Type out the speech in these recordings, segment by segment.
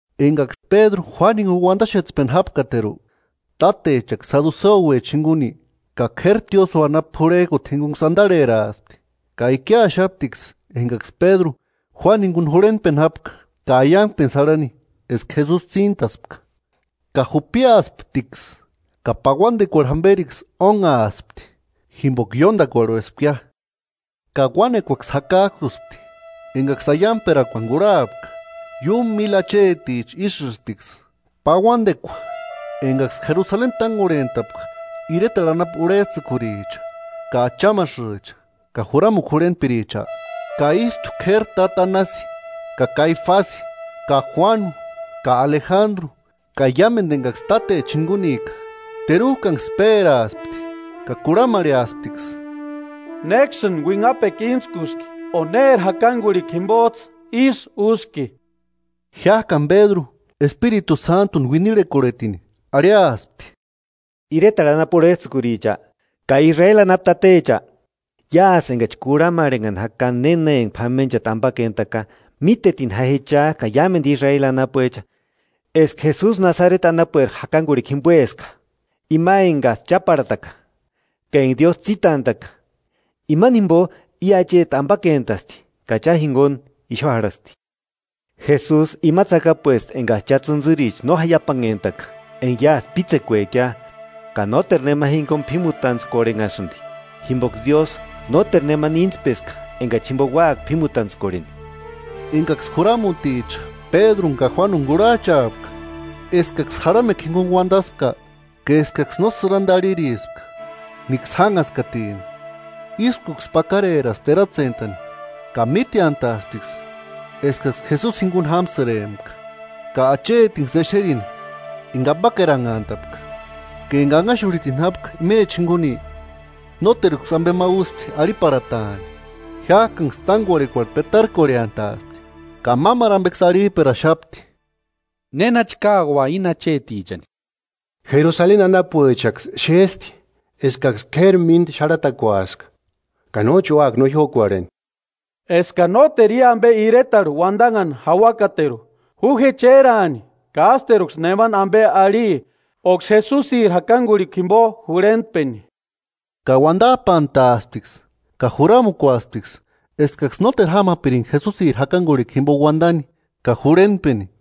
Enkaksï Pédru Juánu jinkuni uantaxetspeni jápkateru, tátechaksï saduseuecha jinkuni ka k'éri tiósïo anapu purhek'uti jinkunksï antarheraaspti, ka ikiaxaptiksï enkaksï Pédru Juánu jinkuni jurhentpeni jápka ka aiankpenksï járhani eska Jesusi tsíntaspka. Ka jupiasptiksï ka pauantekuarhu jamperiksï ónhaaspti, jimpoka ióntakuarhuespkia. Ka uánekuaksï jakak'uspti enkaksï aiankperakuani kurhapka: Iúmu míli acheticha ísïsptiksï. Pauantekua enkaksï Jerusaleni tánkorhent'apka iretarhu anapu urhets'ïkuricha ka achamasïcha ka juramukua jurhentpiricha, ka ístu k'éri táta Anasi, ka Kaifasi ka Juanu ka Alejandru ka iámentu enkaksï tátecha jinkunika. Teruk'anksï péraspti ka kurhamarheasptiksï: –¿Néksïni uinhapekua íntskuski o néri jakankurhikua jimpots'ï ísï úski? Jiák'ani Pédru, Espiritu Sántuni uinirhekorhetini arhiaspti: –Iretarhu anapu urhets'ïkuricha, ka Israeli anapu tatecha: Iásï enkachi kurhamarhenhani jaka néna enka p'amenchati ampakentaka, mítetini ja je cha ka iámentu Israeli anapuecha, eska Jesusi Nasareti anapueri jakankurhikua jimpoeska, ima enkats'ï cháparhata ka enka Diósï tsítant'a'ka, imani jimpo i acheti ampakentasti ka cha jinkuni ixu jarhasti. Jesusi ima tsakapuesti enkats'ï cha tsïntsïricha no jaiapanhentaka, enka iásï pítsekuekia. Ka nóteru nema jinkuni p'ímutantskorhenhasïnti, jimpoka Diósï nóteru nemani íntspeska enkachi jimpo úaka p'ímutantskorheni. Enkaksï juramuticha Pédruni ka Juánuni kurhach'aapka eskaksï jarhamekua jinkuni uantaspka, ka eskaksï no sïranta arhirispka níksï jánhaskatini, ískuksï pakareraspti eratsentani ka míteantaasptiksï eskaksï Jesusi jinkuni jámsïrempka. Ka achetinksï exerini enka ampakeranhantapka ka enka anhaxurhitini jápka imecha jinkuni, nóteruksï ampe ma úspti arhiparhataani. Jiák'anksï tánkorhekuarhu petarkorheantaaspti ka mámaru ampeksï arhip'eraxapti: –¿Nénachi káua íni achetichani? Jerusaleni anapuechaksï xésti eskaksï k'éri mínta xarhatakuaska, ka nóchi úaka no jiókorheni. Eska nóteru i ampe iretarhu uantanhani jáuakateru, ju je chéraani ka ásteruksï nemani ampe arhi óksï Jesusiri jakankurhikua jimpo jurhentpeni. Ka uantap'antaasptiksï ka juramukuasptiksï eskaksï nóteru jámapirinka Jesusiri jakankurhikua jimpo uantani ka jurhentpeni.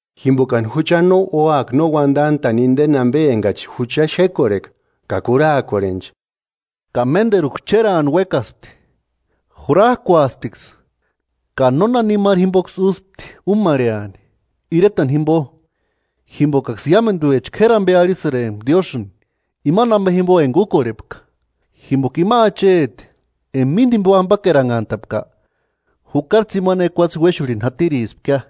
Jimpokani jucha no úaka no uantant'a'ni inteni ampe enkachi jucha xékorheka ka kurhaakorhenchi. Ka ménteruksï chéraani uékaspti, jurak'uasptiksï, ka nónanimaru jimpoksï úspti úmarheani, iretani jimpo, jimpokaksï iámentuecha k'éri ampe arhisïrempka Diósïni imani ampe jimpo enka úkorhepka. Jimpoka ima acheti enka mínta jimpo ampakeranhantapka, jukari tsimani ekuatse uéxurhini jatirispkia.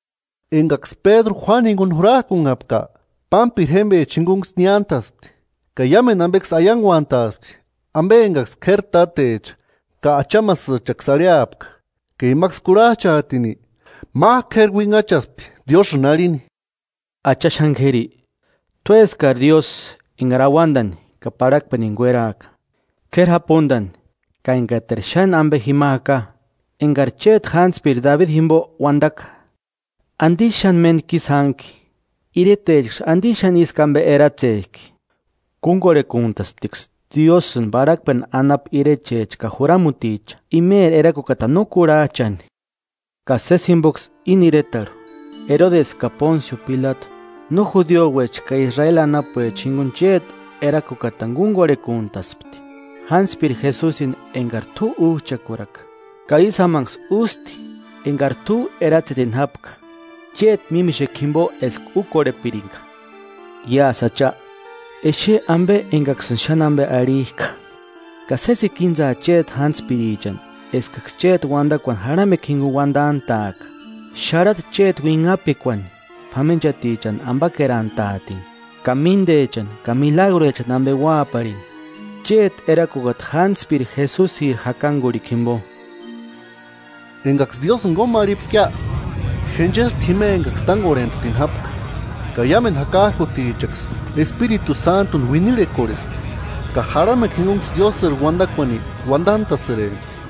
Enkaksï Pédru Juánuni jinkuni jurak'unhapka, pámpiri jémpechanksï jinkunksï niántaspti ka iámentu ampeksï aiankuant'aspti ampe enkaksï k'éri tátecha ka achamasïchaksï arhiapka. Ka imaksï kurhach'aatini, mák'u k'éri uinhachaspti Diósïni arhini: “Acha xáni k'éri, t'úeskari Diósï enkari auantani ka parhakpenini kueraaka, k'éri japuntani ka enkateru xáni ampe jima jaka; enkari chéti jántspiri Dabidi jimpo uantaka: ¿Antisï xáni méntku ísï jánhki, iretechaksï antisï xáni ísku ampe eratsek'i? Kúnkorhekuntastiksï Diósïni parhakpeni anapu irechecha ka juramuticha, imeri Erakukatani no kurhach'ani.” “Ka sési jimpoksï íni iretarhu, Erodesi ka Pónsio Pilatu no judiuecha ka Israeli anapuecha jinkuni chéti erakukatani kunkorhekuntaspti; jántspiri Jesusini enkari t'u úch'akuraka, ka ísï jámanksï ústi, enkari t'u eratsetini jápka chéti mímixekua jimpo eska úkorhepirinka. Iásï Acha, exe ampe enkaksïni xáni ampe arhik'a, ka sésikua íntsaa chéti jántspirichani eskaksï chéti uantakuani jarhamekua jinkuni uantant'a'aka. Xárhata chéti uinhapekuani p'amenchatichani ampakerantaatini ka míntechani ka milagruechani ampe úaparini, chéti erakukata jántspiri Jesusiri jakankurhikua jimpo.” Enkaksï Diósïni kómarhipkia, jenchespti jima enkaksï tánkorhent'atini jápka, ka iámentu jakak'utichaksï Espiritu Sántuni uinirhekorhespti ka jarhamekua jinkunksï Diósïri uantakuani uantant'a'sïrempti.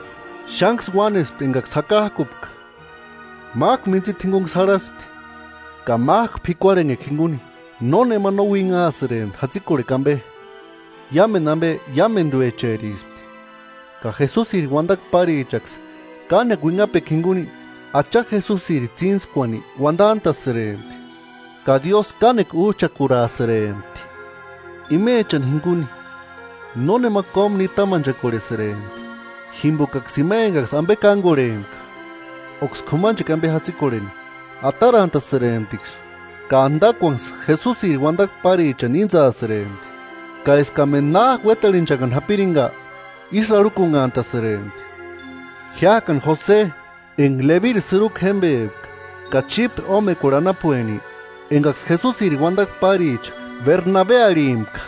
Xánksï uánespti enkaksï jakak'upka, mák'u mintsita jinkuniksï jarhaspti, ka mák'u p'ikuarhenhekua jinkuni. Nónema no uinhaasïrempti jatsikorhekua ampe, iámentu ampe iámentuecherispti. Ka Jesusiri uantakua párichaksï kánekua uinhapekua jinkuni, Acha Jesusiri tsíntskuani uantant'a'sïrempti, ka Diósï kánekua úch'akuraasïrempti. Imechani jinkuni nónema kómu nitamanchakorhesïrempti, jimpokaksï ima enka ampe kánkorhempka óksï k'umanchekua ampe jatsikorheni, atarantasïremptiksï ka antakuanksï, Jesusiri uantakua párichanksï íntsasïrempti. Ka eskamentu na uétarhechanhani japirinka ísï arhukunhasïrempti. Jiák'ani Jose, enka Lebiri sïruku jémpepka ka Chípre ómekuarhu anapueni, enkaksï Jesusiri uantakua páricha Bernabe arhimpka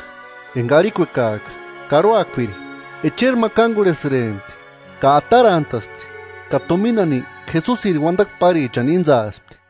(enka arhikuekak'a “Karhuakpiri”), echeri ma kánkorhesïrempti ka atarant'aspti ka tuminani Jesusiri uantakua párichani íntsaspti.